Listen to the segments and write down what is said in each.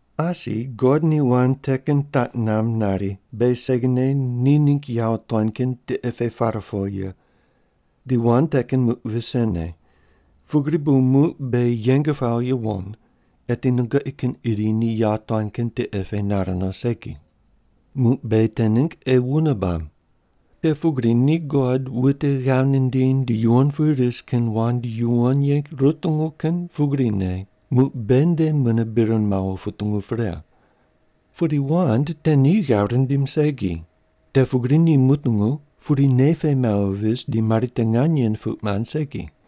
Asi God ni wand te kin taq namb nari beghi segine ni ningg yawotuan kin tiqe pe par po ye. Di wand te kin muq visene, pugri bu muq beghi yeng pawo yuwon, eti nungoqi kin iri ni yawotuan kin tiqe pe nar no segi. Muq beghi te ningg ei wune bab. Te pugri ni God wute ghav nindiny di yuwon pu ris kin wand yuwon ye rutungu kin pugrine muq beghi nde mune bir mawo putungu pre. Pudi wand te ni ghav rindim segi, te pugri ni mutungu pudi nei pe mawo vis di mari te nganye puq mand segi.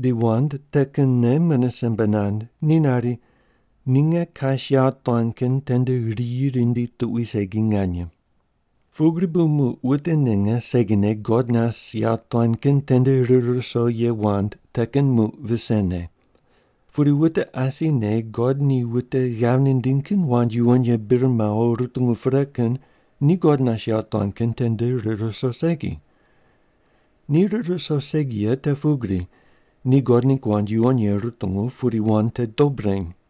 Di wand te kinne mune simbe nand. Ni nari, “Ni nge kas yawotuan kin tende riyi rindi tuqui segi nganye.” Pugri bu muq wute ninge segine God nas yawotuan kin tende rir ruso ye wand te kin muq visene. Pudi wute asine God ni wute ghav nindiny kin wand yuwon ye bir mawo rutungu pre kin ni God nas yawotuan kin tende rir ruso segi. Ni rir ruso segi ye te pugri, ni God ningg wand yuwon ye rutungu pudi wand te dob reny.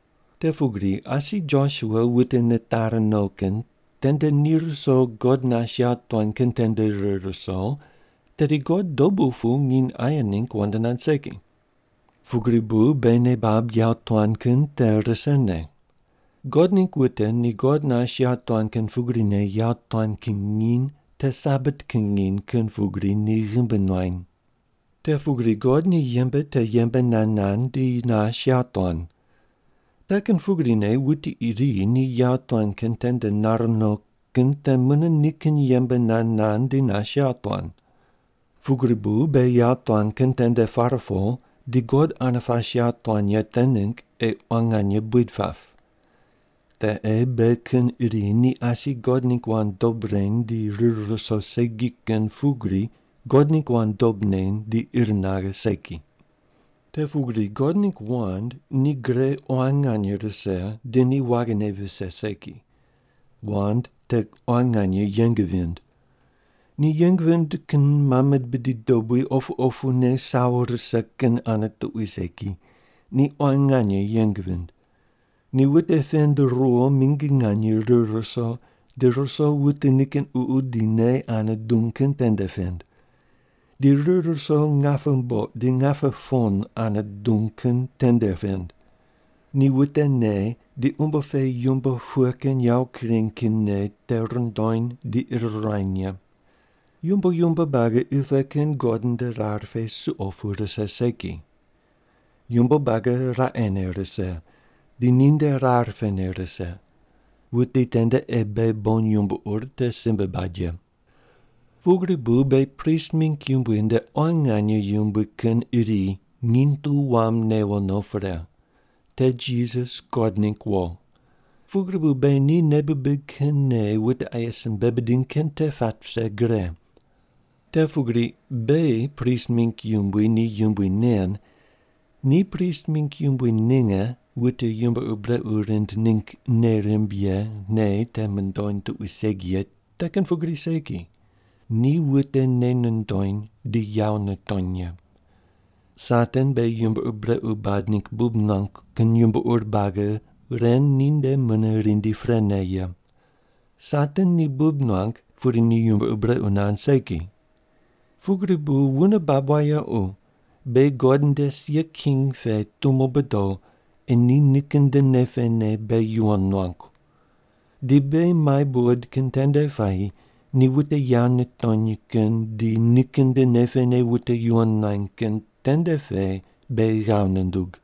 Te pugri asi Josua wute nitari no kin tende ni ruso God nas yawotuan kin tende rir ruso, tedi God dobu pu nginy aye ningg wand nand segi. Pugri bu beghi nei bab yawotuan kin te risene. God ningg wute ni God nas yawotuan kin pugrine yawotuan kin nginy te Sabat kin nginy kin pugri ni ghimbi nuany. Te pugri God ni yembe te yembe nand nand di nas yawotuan. Te kin pugrine wuti iri ni yawotuan kin tende nar no kin te mune nikin yembe nand nand di nas yawotuan. Pugri bu beghi yawotuan kin tende par po di God ane pas yawotuan ye te ningg ei quan nganye buid pap. Te ei beghi kin iri ni asi God ningg wand dob reny di rir ruso segi kin pugri God ningg wand dob neny di ir naghe segi. Te pugri God ningg wand ni gre quan nganye rise di ni waghine vise segi. Wand te quan nganye yeng vind. Ni yeng vind kin mame bidi dobui opu opune sawo rise kin ane tuqui segi, ni quan nganye yeng vind. Ni wute pend ruwo mingi nganye rir ruso di ruso wute nikin ququ di nei ane dung kin tende pend. Di rir ruso ngape mboq di ngape pon ane dung kin tende pend. Ni wute nei di umbo pe yumbo pughe kin yawo kureny kin nei te rundony di ir ruany ye. Yumbo yumbo buagi qi pe kin God nde rar pe suqo pu rise segi. Yumbo buagi raqene rise di ninde rar pene rise. Wuti tende ei beghi bon yumbo ur te simbe bad ye. Pugri bu beghi prist mingg yumbui nde quan nganye yumbui kin iri nginy tu wam newo no pre. Te Jisas God ningg wo. Pugri bu beghi ni nei bibig kin nei wute aye simbe bidiny kin te pat vise gre. Te pugri beghi prist mingg yumbui ni yumbui nen ni prist mingg yumbui ninge wute yumbo ur brequ rind ningg nei rimb ye nei te mundony tuqui segi ye te kin pugri segi, ni wute nei nundony di yawo nitony ye. Satan beghi yumbo ur brequ bad ningg bub nuangu kin yumbo ur buagi ren ni nde mune rindi prene ye. Satan ni bub nuang pudi ni yumbo ur brequ nand segi. Pugri bu wune bab wayequ, beghi God nde sia king pe tumo bodo ei ni nikin nde nei pene beghi yuwon nuangu. Di beghi mai buqod kin tende puayi ni wute yawo nitony kin di nikin nde nei pene wute yuwon nuany kin tende pe beghi ghav nundug.